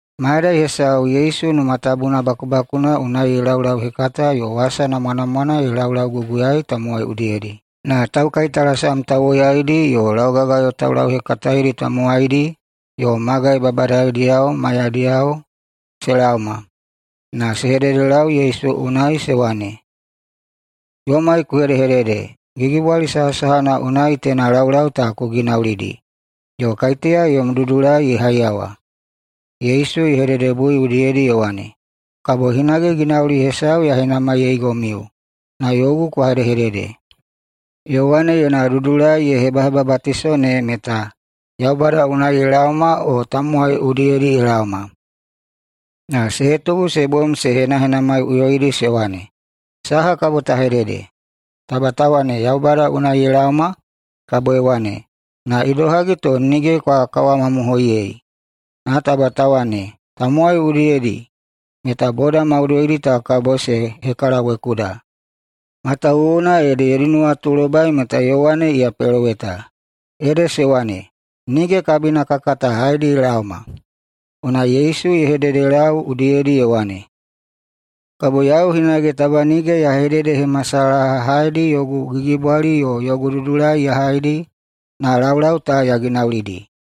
Mayadai hesau Yesu Numa Tabuna bakubakuna unai ye laulauhekata yo wasa namwanamwana ye laulauguguyaei tamowai udiyedi. Na taukaitalasam tauwoyaidi yo laugagayo taulauhekataedi tamowaidi yo magai babadadiyao maiyadiyao se laoma na se hedehededelau Yesu unai se wane, “Yomai ku hedehedede: Gigibwali sahasahana unai teina laulau ta ku ginaulidi, yo kaiteya yom dudulai ye haiyawa?” Yesu ye hededebui udiyedi ye wane, “Kabo yau hinage ginauli hesau ya henamaiyeigomiu na yogu kwa hedehedede: Yowane yona dudulai ye hebahebabatiso ne meta Yaubada unai ye laoma o tamowai udiyedi ye laoma?” Na se hetubu se bom se henahenamaiꞌuyoidi se wane, “Saha kabo ta hedede? Taba ta wane, Yaubada unai ye laoma, kabo ye wane, ‘Na idohagi to nige kwa kawamamohoiyei?’ Na taba ta wane, tamowai udiyedi, meta boda maudoidi ta kabo se hekalawekuda, matawuwuna ede yodi nuwatulobai meta Yowane iya peloweta.” Ede se wane, “Nige kabina ka kata haedi ye laoma.” Unai Yesu ye hededelau udiyedi ye wane, “Kabo yau hinage taba nige ya hededehemasalaha haedi yogu gigibwali yo yogu dudulai ta ya haidi na laulau ta ya ginaulidi.”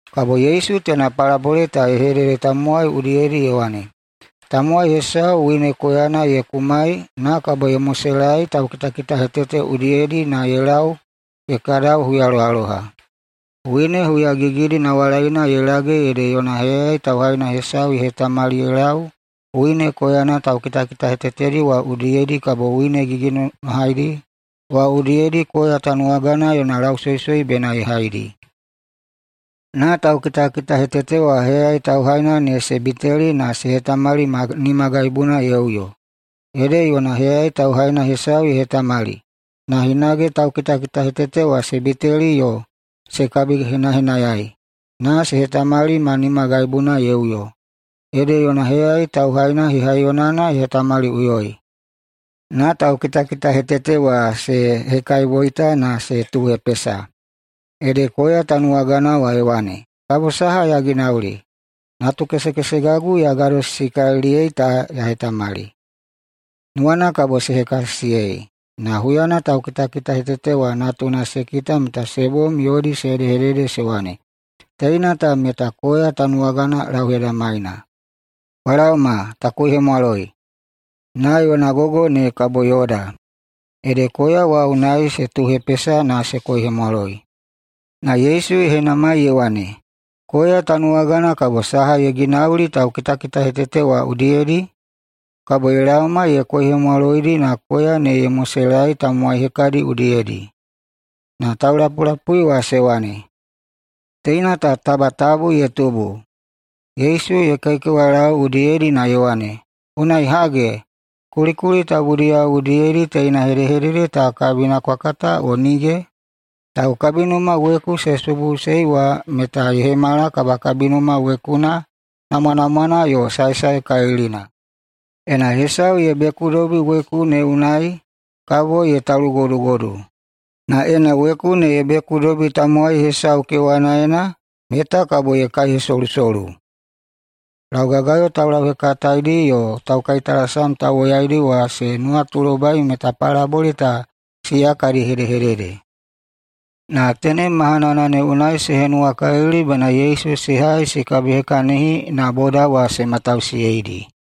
Kabo Yesu teina palabole ta ye hedede tamowai udiyedi ye wane, “Tamowai hesau wine koyana ye kumai na kabo ye moselaei taukitakitahetete udiyedi na ye lau ye kadau huyalohaloha. Wine huyagigidi nawalaina ye lage ede yona heyayai tauhaina hesau ye hetamali ye lau wine koyana taukitakitahetetedi wa udiyedi kabo wine gigigiginonohadi wa udiyedi koya tanuwagana yona lausoisoi bena ye haidi. Na taukitakitahetete wa heyayai tauhaina ne se biteli na se hetamali ma nimagaibuna ye uyo. Ede yona heyayai tauhaina hesau ye hetamali, na hinage taukitakitahetete wa se biteli yo se kabihenahenayai na se hetamali ma nimagaibuna ye uyo. Ede yona heyayai tauhaina hehaiyonana ye hetamaliꞌuyoi. Na taukitakitahetete wa se hekaiboita na se tuuhepesa. Ede koya tanuwagana wa ye wane, ‘Kabo saha ya ginauli? Natu kesekesegagu ya gadosisikaliliyei ta ya hetamali. Nuwana kabo se hekasisiyei.’ Na huyana taukitakitahetete wa natuna se kita meta se bom yodi se hedehedede se wane, ‘Teina ta meta koya tanuwagana lauhedamaina. Kwa laoma ta koihemwaloi, na yona gogo ne kabo yoda!’ Ede koya wa unai se tuuhepesa na se koihemwaloi.” [Na Yesu ye henamai ye wane,] “Koya tanuwagana kabo saha ye ginauli taukitakitahetete wa udiyedi? Kabo ye laoma ye koihemwaloidi na koya ne ye moselaei tamowai hekadi udiyedi.” Na taulapulapui wa se wane, “Teina ta taba tabu ye tubu!” Yesu ye kaikewalau udiyedi na ye wane, “Unai hage, kulikuli tabudiyao udiyedi teina hedehedede ta kabina kwa kata o nige? ‘Taukabinuma weku se subuꞌusei wa meta ye hemala kabakabinuma wekuna namwanamwana yo saesaekalilina.’ Ena hesau ye bekudobi weku ne unai kabo ye talugodugodu, na ena weku ne ye bekudobi tamowai hesau kewanaena meta kabo ye kaihesolusolu.” Laugagayo taulauhekataedi yo taukaitalasam tauwoyaidi wa se nuwatulobai meta palabole ta siya kadi hedehedede. Na tenem mahanana ne unai se henuwakalili bena Yesu se hai se kabihekahini, na boda wa se matausiyeidi.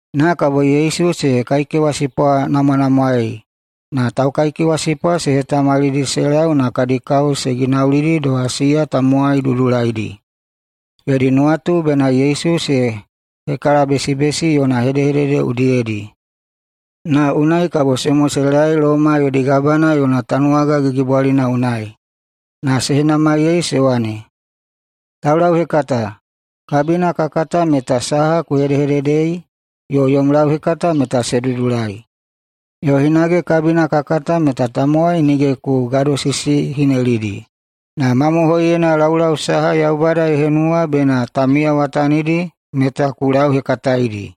Na kabo Yesu se kaikewasipwanamwanamwaei na taukaikewasipwa se hetamalidi se lau na kadi kao se ginaulidi doha siya tamowai dudulaidi. Yodi nuwatu bena Yesu se hekalabesibesi yona hedehedede udiyedi, na unai kabo se moselaei Loma yodi gabana yona tanuwaga gigibwalina unai. Na se henamaiyei se wane, “Taulauhekata, kabina ka kata meta saha ku hedehededeidi yo yom lauhekata meta se dudulai. Yo hinage kabina ka kata meta tamowai nige ku gadosisihinelidi, na mamohoiyena laulau saha Yaubada ye henuwa bena ta miyawatanidi meta ku lauhekataedi.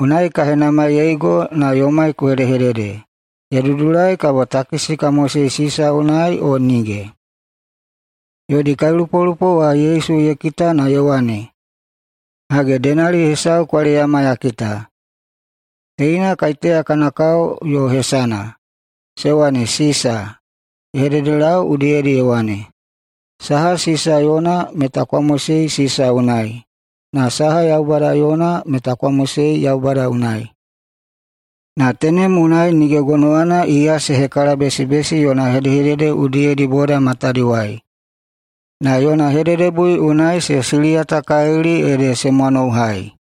Unai ka henamaiyeigo na yomai ku hedehedede: Ye dudulai kabo takisi ka mosei Sisa unai o nige?” Yodi kailupolupo Yesu ye kita na ye wane, “Hage, denali hesau kwa leyama ya kita. Teina kaiteya kana kao yo hesana?” Se wane, “Sisa.” Ye hededelau udiyedi ye wane, “Saha Sisa yona meta kwa mosei Sisa unai, na saha Yaubada yona meta kwa mosei Yaubada unai.” Na tenem unai nige gonowana iya se hekalabesibesi yona hedehedede udiyedi boda matadiwai. Na yona hededebui unai se siliyatakalili, ede se mwanouhai.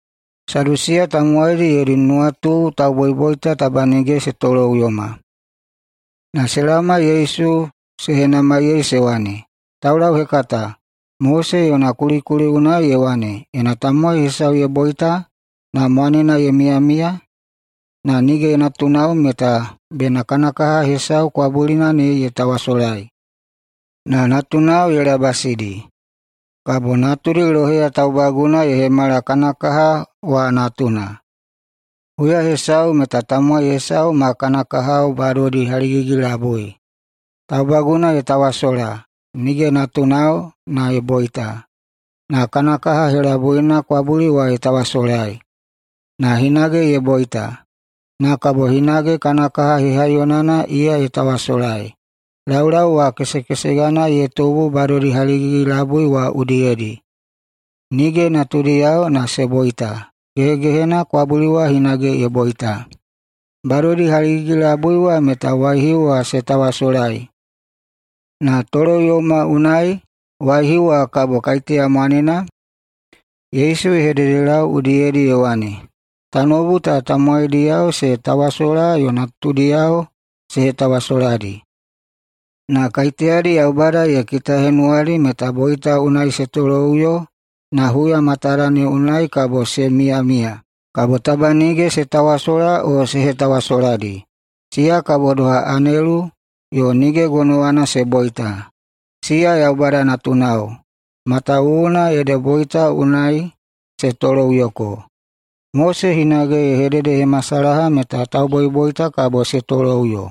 Sadusiya tamowaidi yodi nuwatu tauboiboita taba nige se toloꞌuyoma. Na se laoma Yesu se henamaiyei se wane, “Taulauhekata, Mose yona kulikuli unai ye wane, ‘Ena tamowai hesau ye boita, na mwanena ye miyamiya, na nige natunao, meta bena kana kaha hesau kwabulina ne ye tawasolai na natunao ye labasidi, kabo natudi loheya taubaguna ye hemala kana kaha wa natuna.’ Huya hesau meta tamowai hesau ma kana kahao, badodi haligigi-labui. Taubaguna ye tawasola, nige natunao, na ye boita. Na kana kaha helabuina kwabuli wa ye tawasolai, na hinage ye boita. Na kabo hinage kana kaha hehaiyonana iya ye tawasolai. Laulau wa kesekesegana ye tubu badodi haligigi-labui wa udiyedi. Nige natudiyao na se boita. Gehegehena kwabuli wa hinage ye boita. Badodi haligigi-labui wa meta waihiu wa se tawasolai, na toloꞌuyoma unai waihiu wa kabo kaiteya mwanena?” Yesu ye hededelau udiyedi ye wane, “Tanoubu ta tamowaidiyao se tawasola yo natudiyao se hetawasoladi. Na kaiteyadi Yaubada ye kitahenamwadi meta boita unai se toloꞌuyo na huya matada ne unai kabo se miyamiya, kabo taba nige se tawasola o se hetawasoladi. Siya kabo doha anelu yo nige gonowana se boita. Siya Yaubada natunao, matawuwuna ede boita unai se toloꞌuyoko. Mose hinage ye hededehemasalaha meta tauboiboita kabo se toloꞌuyo.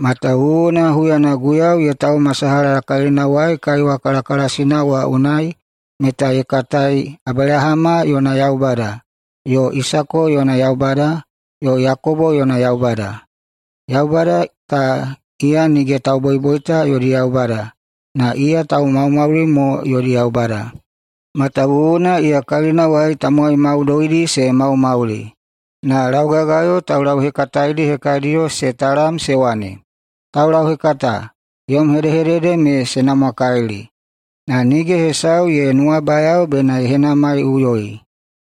Matawuwuna huyana Guiyau ye taumasalaha kalinawai kaiwa kalakalasina wa unai, meta ye katai, ‘Abelahama yona Yaubada, yo Isako yona Yaubada, yo Yakobo yona Yaubada.’ Yaubada ta iya nige tauboiboita yodi Yaubada, na iya taumaumauli mo yodi Yaubada. Matawuwuna iya kalinawai tamowai maudoidi se maumauli.” Na laugagayo taulauhekataedi hekadiyo se talam se wane, “Taulauhekata, yom hedehedede me se namwakalili!” Na nige hesau ye nuwabayao bena ye henamaiꞌuyoi.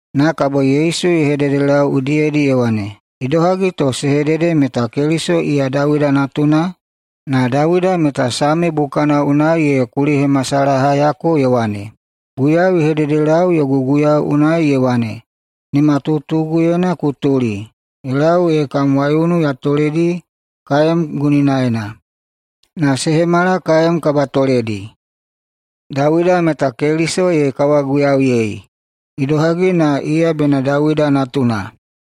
Na kabo Yesu ye hededelau udiyedi ye wane, “Idohagi to se hedede meta Keliso iya Dawida natuna? Na Dawida meta Same bukana unai ye kulihemasalahayako ye wane, ‘Guiyau ye hededelau yogu Guiyau unai ye wane, “Nimatutuguyena ku tuli ye lau ee kam waiunu ya toledi kaem guninaena na se hemala kaem kabatoledi.” ’ Dawida meta Keliso ye kawaguiyauyei. Idohagi na iya bena Dawida natuna?”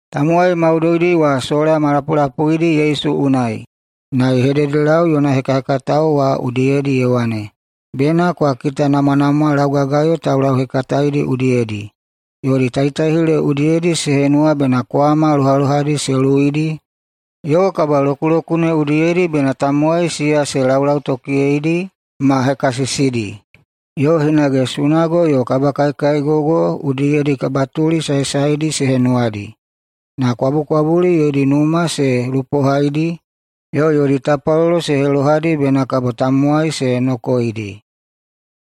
Tamowai maudoidi wa sola ma lapulapuidi Yesu unai, na ye hededelau yona hekahekatao wa udiyedi ye wane, “Bena kwa kitanamwanamwa laugagayo taulauhekataedi udiyedi. Yodi taitaihile udiyedi se henuwa bena kwama lohalohadi se luwuidi yo kabalokulokune udiyedi bena tamowai siya se laulautokiyeidi ma hekasisidi, yo hinage sunago yo kabakaikaigogo udiyedi kabatuli saesaedi se henuwadi. Na kwabukwabuli yodi numa se lupohaidi, yo yodi tapwalolo se helohadi bena kabo tamowai se nokoeidi.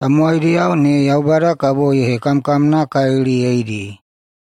Tamowaidiyao ne Yaubada kabo ye hekamkamnakaliliyeidi.”